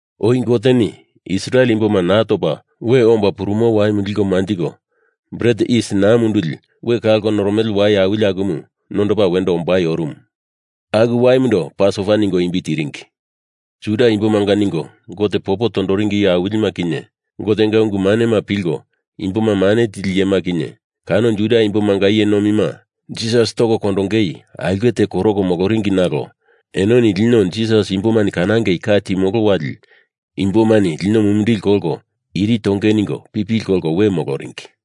Oi Goteni Israel imboma naa topa we omba purumo waimu liko manjiko Bret Yis Naa Munduli we kalko noromele wai awili akumu nondopa wendo ombai orumu. Aku waimundo Pasova ningo imbi tiringi. Juda imbomanga ningo Gote popo tondoringi iye awilima kinye, Gotenga ungu manema pilko imboma mane tili iyema kinye, kano Juda imbomanga iye nomima Jisas toko kondonge aulke te koroko moloringi nalo enoni lino Jisas imbomani kanangei ka timolo wali imbomani lino mumindili kolko iri tonge ningo pipili kolko we moloringi.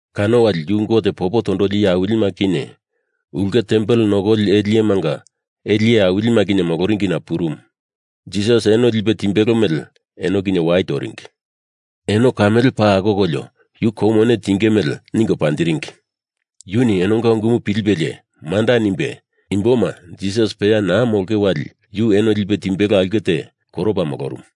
Kano wali yu Gote popo tondoli iye awilima kinye ulke tempel nokoli ele iyemanga ele iye awilima kinye moloringina purumu. Jisas eno lipe timbelo mele eno kinye wai toringi. Eno kamele paa akokolio yu kou mone tinge mele ningo panjiringi. Yuni enonga unguma pilipelie, manda nimbe, imboma Jisas peya naa molonge wali yu eno lipe timbelo aulke te koropa molorumu.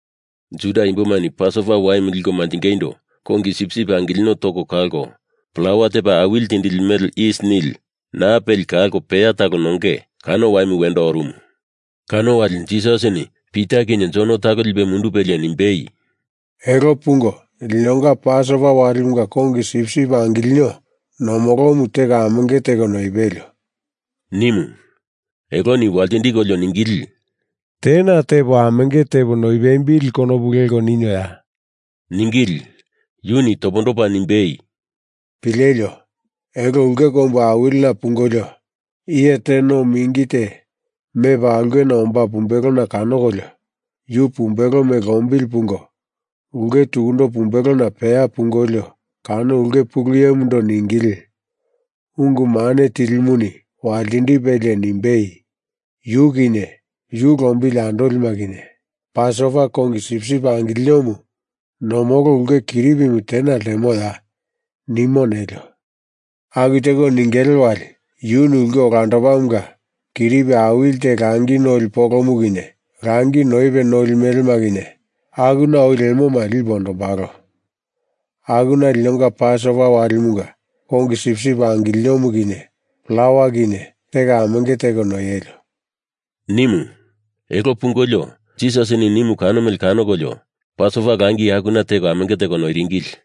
Juda imbomani Pasova Waimu liko manjingeindo kongi sipsip angilino toko kalko plawa tepa awili tindili mele yis nili naa peli kalko peya talo nonge, kano waimu wendo orumu. Kano wali Jisasini Pita kinye Jon talo lipe mundupelie nimbei, “Elo pungo linonga Pasova Walimunga kongi sipsip angilino nomolomu teko amenge teko noipelio,” nimu. Eloni waltindikolio ningili, “Tena tepo amenge tepo noipembili konopu leko ninoya?” ningili. Yuni topondopa nimbei, “Pilelio! Elo ulke kombu awilina pungolio, iye te no mingi te mepa aulkena omba pumbelona kanokolio, yu pumbelo mele lombili pungo ulke tukundo pumbelona peya pungolio kano ulke pulu iyemundo ningili, Ungu Mane Tilimuni waltindipelie nimbei, ‘Yu kinye yu lombili andolima kinye Pasova kongi sipsip angilinomu nomolo ulke kiripimu tena ltemoya?’ nimu nelio! Aku teko ningele wali yuni ulke olandomunga kiripi awili te langi noli polomu kinye langi noipe noli melema kinye akuna oi lemoma, lipe ondombalo. Akuna linonga Pasova Walimunga kongi sipsip angilinomu kinye plawa kinye teko amenge teko noielio,” nimu. Elo pungolio, Jisasini nimu kano mele kanokolio Pasova langi akuna teko amenge teko noiringili.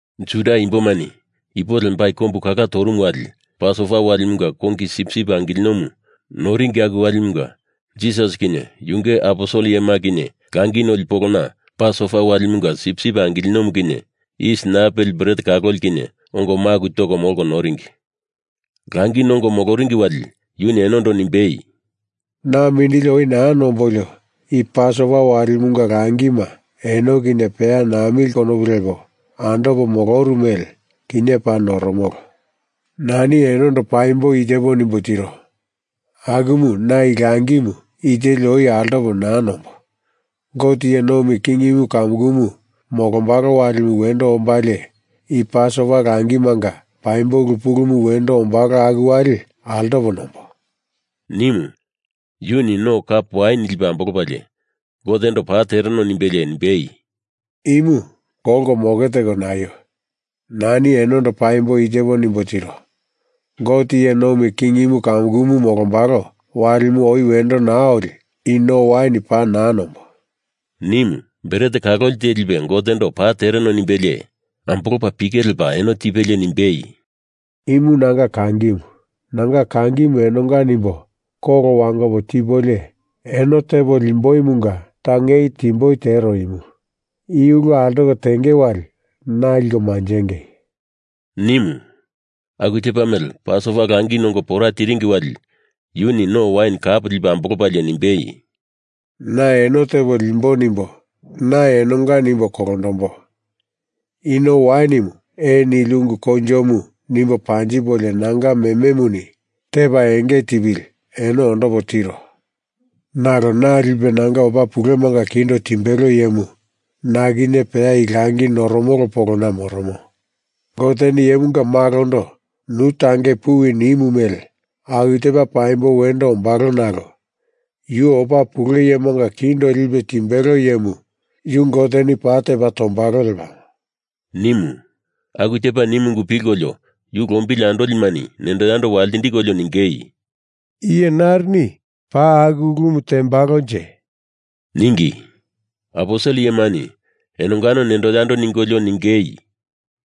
Juda Imbomani ipo lembai kombu kala torumu wali Pasova Walimunga kongi sipsip angilinomu noringi aku walimunga Jisas kinye yunge aposel iyema kinye langi noli polona Pasova Walimunga sipsip angilinomu kinye yis naa peli bret kaloli kinye ongo maku toko molko noringi. Langi nongo moloringi wali yuni enondo nimbei, “Na mindili oi naa nombolio i Pasova Walimunga langima eno kinye peya namili konopu lepo andopo moloru mele kinye paa noromolo. Nani enondo paimbo i tepo nimbo tiro. Akumu na i langimu i teli oi altopo naa nombo. Gote iye nomi kingimu kamukumu molombalo walimu wendo ombalie i Pasova langimanga paimbo ulu pulumu wendo ombalo aku wali altopo nombo,” nimu. Yuni no kap wain lipe ambolopalie Gotendo paa tereno nimbelie nimbei, “Imu kolko moke teko naio! Nani enondo paimbo i tepo nimbo tiro. Gote iye nomi kingimu kamukumu molombalo walimu oi wendo naa oli i no wain paa naa nombo,” nimu. Bret kaloli te lipe Gotendo paa tereno nimbelie ambolopa pike lepa eno tipelie nimbei, “Imu nanga kangimu. Nanga kangimu enonga nimbo kolo wangopo tipolio eno tepo limboimunga tangei timboi tero imu. I ulu altoko tenge wali na liko manjengei,” nimu. Aku tepa mele Pasova langi nongo pora tiringi wali yuni no wain kap lipe ambolopalie nimbei, “Na eno tepo limbo nimbo na enonga nimbo kolondombo. I no wainimu ee nili ungu koinjomu nimbo panjipolio nanga mememuni tepa enge tipili eno ondopo tiro. Nalo na lipe nanga opa pulemanga kindo timbelo iyemu na kinye peya i langi noromolo polona moromo. Goteni Iyemunga Malondo nu tangei puwi nimu mele aku tepa paimbo wendo ombalo nalo Yu opa pule iyemanga kindo lipe timbelo iyemu yu Goteni paa tepa tombalo lepamo,” nimu. Aku tepa nimu ungu pilkolio yu lombili andolimani nendo yando waltindikolio ningei, “Iye narini paa aku ulumu tembalonje?” ningi. Aposel iyemani enongano nendo yando ningolio ningei,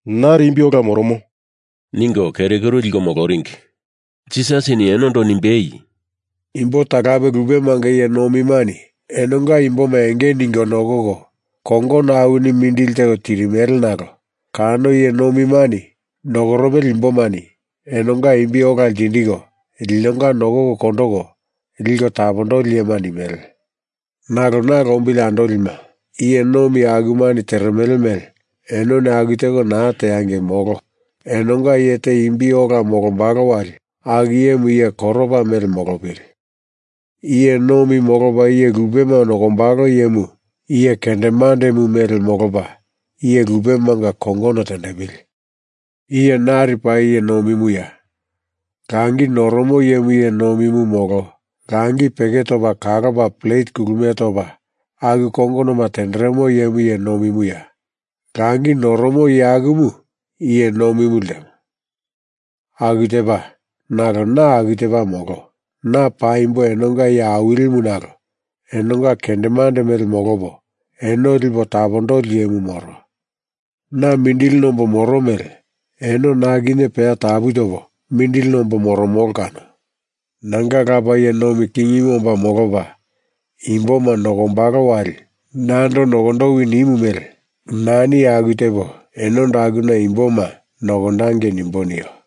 “Nari imbi ola moromo,” ningo keru kuru liko moloringi. Jisasini enondo nimbei, “Imbo talape lupemanga iye nomimani enonga imboma enge ningo nokoko kongono awini mindili teko tirimele nalo kano iye nomimani nokoromele imbomani enonga imbi ola ltindiko, linonga nokoko kondoko liko tapondoli iyema nimele. Nalo na lombili andolima, iye nomi akumani teremele mele enoni aku teko naa teangei, molo! Enonga iye te imbi ola molombalo wali aku iyemu iye koropa mele molopili! Iye nomi molopa iye lupema nokombalo iyemu iye kendemandemu mele molopa iye lupemanga kongono tendepili! Iye nari paa iye nomimuya? Langi noromo iyemu iye nomimu molo langi peke topa kalopa plet kulumie topa aku kongonoma tenderemo iyemu iye nomimuya? Langi noromo iye akumu iye nomimu ltemo. Aku tepa, nalo na aku tepa molo. Na paimbo enonga iye awilimu nalo enonga kendemande mele molopo eno lipo tapondoli iyemu moro. Na mindili nombo moro mele eno na kinye peya tapu topo mindili nombo moromolo kano. Nanga Lapa iye nomi kingimu omba molopa imboma nokombalo wali nando nokondowi nimu mele nani aku tepo enondo akuna imboma nokondangei nimbo nio.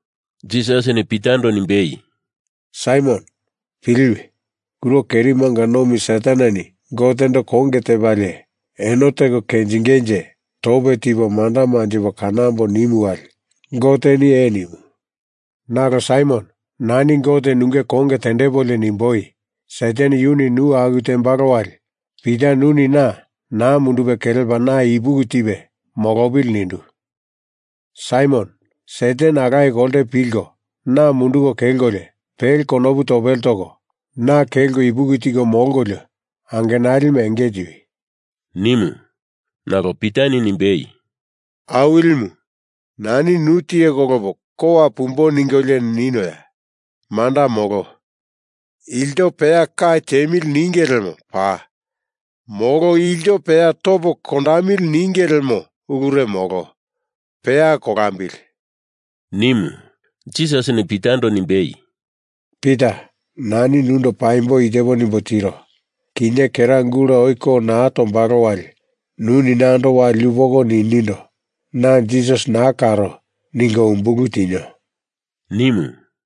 Jisasini Pitando nimbei, “Saimon, piliwi! Kuro kerimanga nomi Sataneni Gotendo konge tepalie eno teko kenjingenje tope tipo manda manjipo kanambo nimu wali Goteni ee nimu. Nalo Saimon, nani Gote nunge konge tendepolio nimboi, Satan yuni nu aku tembalo wali Pita nuni na naa mundupe kelepa na ipuki tipe molopili nindu. Saimon, Satan alaye kolte pilko na munduko kelkolio, pele konopu topele toko na kelko ipuki tiko molkolio, angenalima enge tiwi,” nimu. Nalo Pitani nimbei, “Awilimu, nani nu tiye kolopo kowa pumbo ningolio ninoya? Manda molo. Ilto peya ka tiemili ninge lemo paa. Molo ilto peya topo kondamili ninge lemo ulure molo. Peya kolambili,” nimu. Jisasini Pitando nimbei, “Pita, nani nundo paimbo i tepo nimbo tiro. Kinye kera gula oi ko naa tombalo wali nuni nando wali yupoko ninindo, ‘Na Jisas naa karo,’ ningo umbulu tinio,” nimu.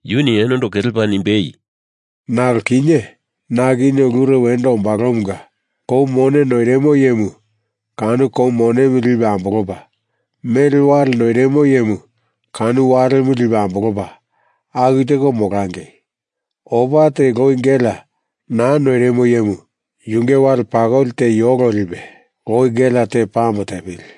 Yuni enondo kelepa nimbei, “Nalo kinye na kinye ulure wendo ombalomunga, kou mone noirimo iyemu kano kou monemu lipe ambolopa, mele wale noirimo iyemu kano walemu lipe ambolopa, aku teko molangei! Opa teli loi gelea naa noirimo iyemu yunge wale pakoli te yoko lipe loi gelea te pame tepili!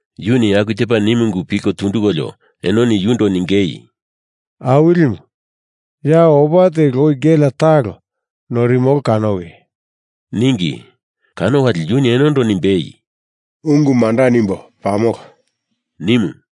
Yuni aku tepa nimu ungu pilko tundukolio enoni yundo ningei, “Awilimu, ya opa teli loi gelea talo noirimolo kanowi,” ningi. Kano wali yuni enondo nimbei, “Ungu manda nimbo, pamolo,” nimu.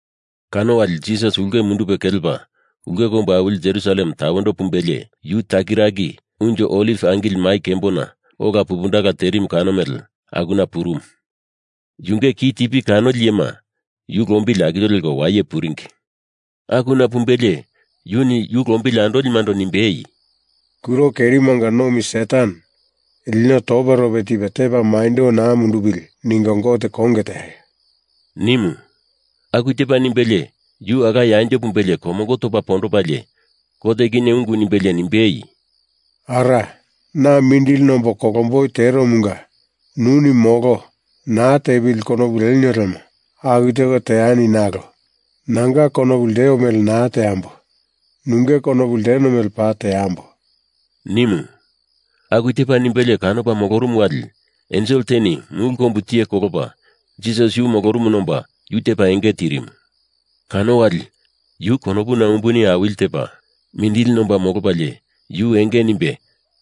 Kano wali Jisas ulke mundupe kelepa ulke kombu awili Jerusalem tawendo pumbelie, yu takiraki Unjo Oliv Angili Mai Kembona ola pupundala terimu kano mele akuna purumu. Yunge ki tipi kanoli iyema yu lombili akilio leko waye puringi. Akuna pumbelie yuni yu lombili andolimando nimbei, “Kuro kerimanga nomi Satan lino toperope tipe tepa maindo naa mundupili ningo Gote konge teaio,” nimu. Aku tepa nimbelie yu alaye anjo pumbelie komongo topa pondopalie, Gote kinye ungu nimbelie nimbei, “Ara, na mindili nombo kolomboi teromunga nuni molo, naa tepili konopu lenio lemo aku teko teani nalo nanga konopu lteo mele naa teamboi. Nunge konopu lteno mele paa teambo,” nimu. Aku tepa nimbelie kanopa molorumu wali, ensel teni mulu kombu tiye kolopa Jisas yu molorumuna omba yu tepa enge tirimu. Kano wali, yu konopuna umbuni awili tepa, mindili nomba molopalie yu enge nimbe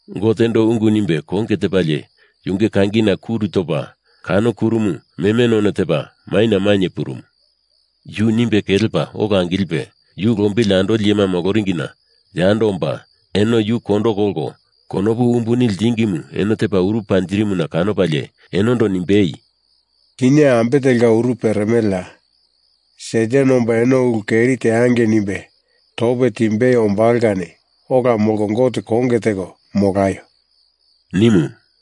Gotendo ungu nimbe konge tepalie yunge kangina kuru topa kano kurumu meme none tepa maina mainye purumu. Yu nimbe kelepa ola angilipe yu lombili andoli iyema moloringina yando omba eno yu kondo kolko konopu umbuni ltingimu eno tepa uru panjirimuna kanopalie enondo nimbei, “Kinye ambe telka uru peremeleya? Satan omba eno ulu keri teangei nimbe tope timbei ombalo kani ola molko Gote konge teko molaio,” nimu.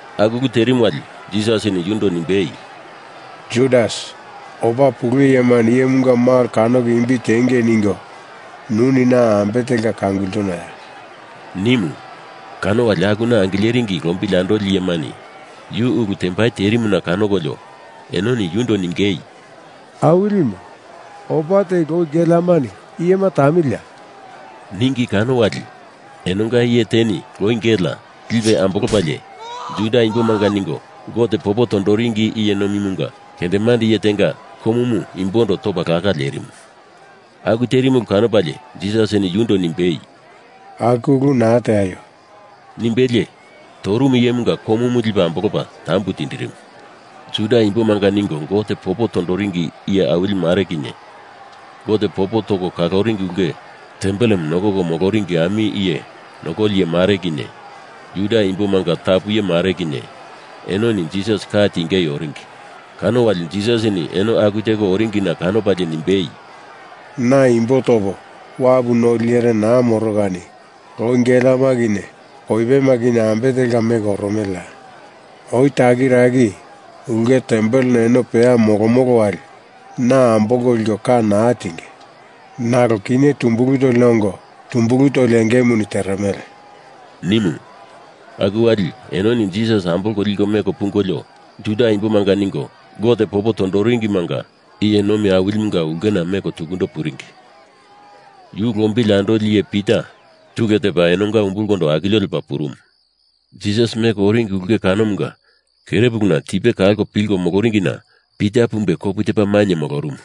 Aku ulu terimu wali Jisasini yundo nimbei, “Judas, opa pule iyemani Iyemunga Malo kanoko imbi tiengei ningo nuni na ambe telka kangultunoya?” nimu. Kano wali akuna angileringi lombili andoli iyemani yu ulu tembai terimuna kanokolio enoni yundo ningei, “Awilimu, opa teli loi geleamani iyema tamiliya?” ningi kano wali enonga iye teni loi gelea lipe ambolopalie Juda imbomanga ningo Gote popo tondoringimanga iye nomimunga kendemande iye tenga komumu imbondo topa laka ltenderimu. Aku terimu ulu kanopalie Jisasini yundo nimbei, “Aku ulu naa teaio,” nimbelie torumu iyemunga komumu lipe ambolopa tambu tindirimu. Juda imbomanga ningo Gote popo tondoringi iye awili mare kinye, Gote popo toko kaloringi ulke tempelemu nokoko moloringi ami iye nokoli iye mare kinye, Juda imbomanga tapu iye mare kinye, enoni Jisas ka tingei oringi. Kano wali Jisasini eno aku teko oringina kanopalie nimbei, “Na imbo topo wapu noli iyere naa moro kani loi geleama kinye koipema kinye ambe telka meko oromeleya? Oi takiraki ulke tempelena eno peya molomolo wali na ambolko liko ka naa tinge. Nalo kinye tumbulu tolina ongo tumbulu toli engemuni teremele,” nimu. Aku wali enoni Jisas ambolko liko meko pungolio Juda imbomanga ningo Gote popo tondoringimanga iye nomi awilimunga ulkena tukundo meko puringi. Yu lombili andoli iye Pita tule tepa eno umbulkondo akilio lepa purumu. Jisas meko oringi ulke kanomunga kerepuluna tipe kalko pilko moloringina Pita pumbe kopu tepa mainye molorumu.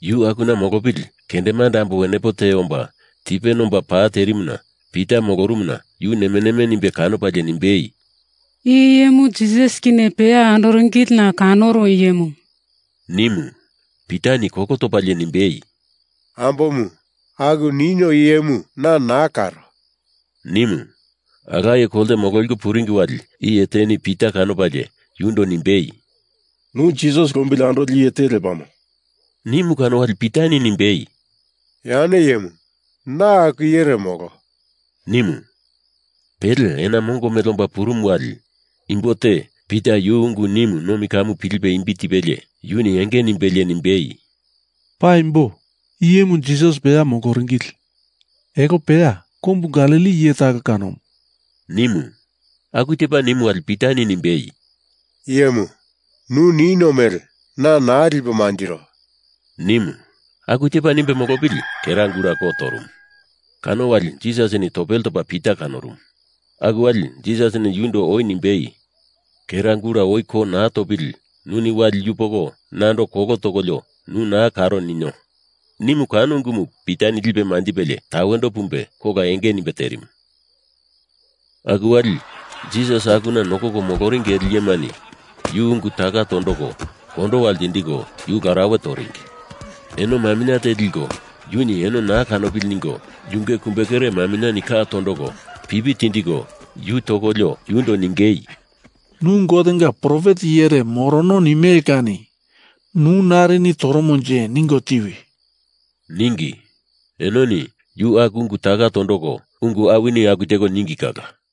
Yu akuna molopili kendemande ambo wenepo te omba tipe nomba pa terimuna Pita molorumuna yu neme neme nimbe kanopalie nimbei, “I iyemu Jisas kinye peya andoringilina kanoru iyemu,” nimu. Pitani kolo topalie nimbei, “Ambomu, aku nino iyemu na naa karo,” nimu. Alaye kolte mololiko puringi wali iye teni Pita kanopalie yundo nimbei, “Nu Jisas lombili andoli iye te lepamo,” nimu kano wali Pitani nimbei, “Yane iyemu, na aku iyere molo,” nimu. Pele ena mongo mele omba purumu wali imbo te Pita yu ungu nimu nomi ka pilipe imbi tipelie yuni enge nimbelie nimbei, “Paimbo, i iyemu Jisas peya moloringili. Elo peya kombu Galili iye talo kanomu,” nimu. Aku tepa nimu wali Pitani nimbei, “Iyemu, nu nino mele na naa lipo manjiro,” nimu. Aku tepa nimbe molopili kera gula ko torumu. Kano wali Jisasini topele topa Pita kanorumu. Aku wali Jisasini yundo oi nimbei, kera gula oi ko naa topili nuni wali yupoko nando kolo tokolio yu naa karo ninio. nimu kano ungumu Pitani lipe manjipelie tawendo pumbe kola enge nimbe terimu. Aku wali Jisas akuna nokoko moloringi ele iyemani yu ungu taka tondoko kondowa ltindiko yu larauwe toringi. Eno maminye te liko yuni eno naa kanopili ningo yunge kumbekere maminye ka tondoko pipi tindiko yu tokolio yundo ningei, “Nu Gotenga profet iyere morono nimele kani nu nari toromonje ningo tiwi,” ningi. Enoni yu aku ungu taka tondoko ungu awini aku teko ningi kala.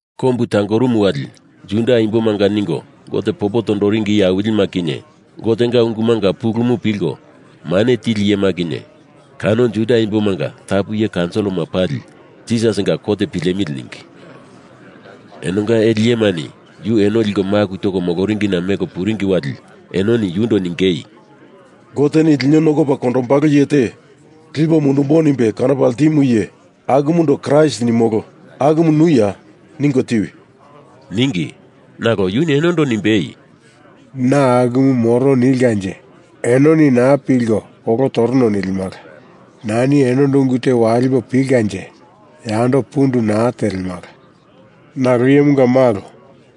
Kombu tangorumu wali Juda imbomanga ningo Gote popo tondoringi iye awilima kinye, Gotenga ungumanga pulumu pilko mane tili iyema kinye, kano Juda imbomanga tapu iye kaunsilima pali Jisasinga kot pilemili ningi. Enonga ele iyemani yu eno liko maku toko moloringina meko puringi wali enoni yundo ningei, “Goteni lino nokopa kondombalo iye te lipo mundumbo nimbe kanopa ltimu iye, akumundo Kraist nimolo akumu nuya, ningo tiwi,” ningi. Nalo yuni enondo nimbei, “Na akumu moro nilkanje enoni naa pilko kolo torono nilimala. Nani enondo ungu te walipo pilkanje yando pundu naa telemala. Nalo Iyemunga Malo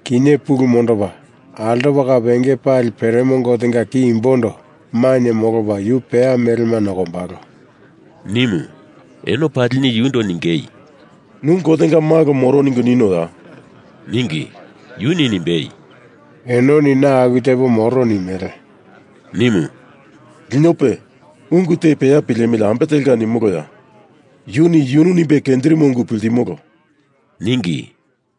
kinye pulu mondopa altopa kape enge pali peremo Gotenga ki imbondo mainye molopa yu peya melema nokombalo,” nimu. Eno palini yundo ningei, “Nu Gotenga Malo moro ningo ninoya?” ningi. Yuni nimbei, “Enoni na aku tepo moro nimele,” nimu. “Linope, ungu te peya pilemili ambe telka nimoloya? Yuni yunu nimbe kenjirimo ungu piltimolo,” ningi.